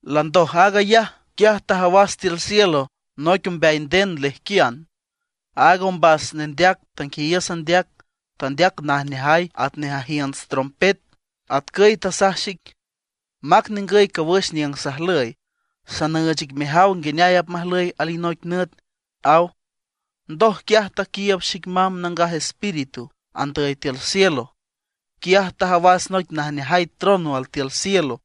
Landoj aag ayaj, quiaj tajawas tiül cielo noic ombeay nden lejquian. Aaga ombas nendeac tanguiayiüs andeac, tandeac najneajay atnej ajiünts trompet, atcüy tasaj xic: ―Mac ningüy cawüx niüng sajlüy. Sanüüch ic mejaw nguineay apmajlüy alinoic nüt ―aw. Ndoj quiaj taquiiüb xic mamb Nangaj Espíritu andüy tiül cielo. Quiaj tajawas noic najneajay trono altiül cielo;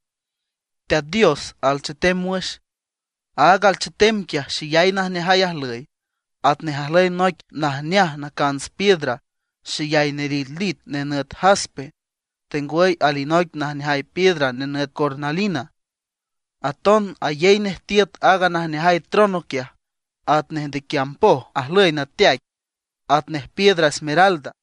Teat Dios alchetem wüx. Aaga alchetem quiaj xeyay najneajay ajlüy, atnej ajlüy noic najneaj nacants piedra xeyay nelitlit nenüt jaspe, tengwüy alinoic najneajay piedra nenüt cornalina. Aton ayey nej tiüt aaga najneajay trono quiaj, atnej ndequiamb poj ajlüy nateaic, atnej piedra esmeralda.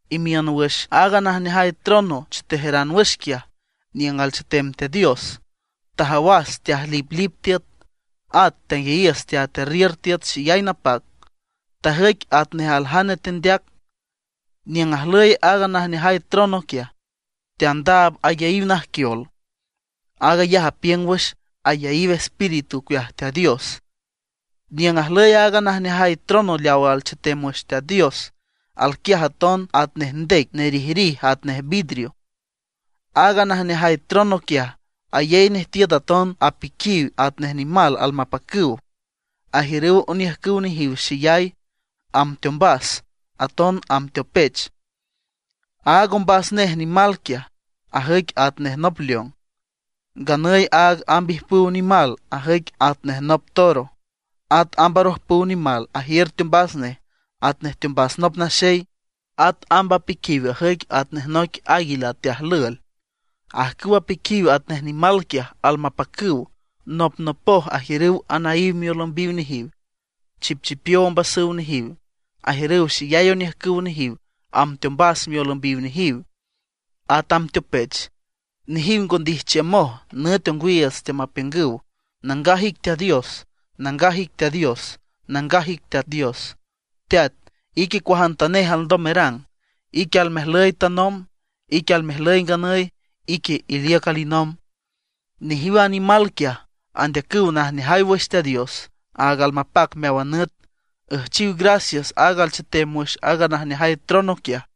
Imiün wüx aaga najneajay trono chetejeran wüx quiaj, niüng alchetem Teat Dios, tajawas teajliplip tiüt; at tanguiayiüs teatearriür tiüt xeyay napac, tajüic atnej aljane teandeac. Niüng ajlüy aaga najneajay trono quiaj, teandaab ayaíw najquiol. Aag ayaj apiüng wüx ayaíw Espíritu ocueaj Teat Dios. Niüng ajlüy aaga najneajay trono leaw alchetem wüx Teat Dios, alquiaj aton atnej ndec nerijrij atnej vidrio. Aaga najneajay trono quiaj, ayey nej tiüt aton apiquiw atnej nimal almapacüw, ajiürüw oniüjcüw nejiw xeyay, amb teombas, aton amb teopech. Aaga ombas nej nimal quiaj ajüic atnej nop león; nganüy aaga amb ijpüw nimal ajüic atnej nop toro; at amb arojpüw nimal ajiür teombas nej atnej teombas nop naxey; at amb apiquiw ajüic atnej noic águila teajlüel. Ajcüw apiquiw atnej nimal quiaj almapacüw, nopnopoj ajiürüw anaíw miolümbiw nejiw, chipchipiow ombasüw nejiw ajiürüw xeyay oniüjcüw nejiw amb teombas miolümbiw nejiw, at amb teopech. Nejiw ngo ndijchiümoj, nüt ongwiiüts teamapiüngüw: Nangaj ic Teat Dios, nangaj ic Teat Dios, nangaj ic Teat Dios. Teat, ique cuajantanej alndom merang. Ique almejlüy tanomb, ique almejlüy nganüy, ique iliüc alinomb. Nejiw a nimal quiaj andeacüw najneajay wüx Teat Dios, aag almapac meáwan nüt. Üjchiw gracias aaga alchetem wüx aaga najneajay trono quiaj.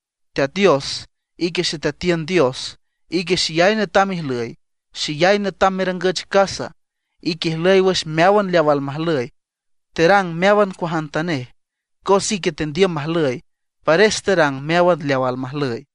Teat Dios, ique Xeteatiün Dios. Ique xeyay netam ijlüy, xeyay netam merangüch casa. Ique ijlüy wüx meáwan leaw almajlüy, terang meáwan cuajantanej. Cos ique tendiüm majlüy, pares terang meáwan leaw almajlüy.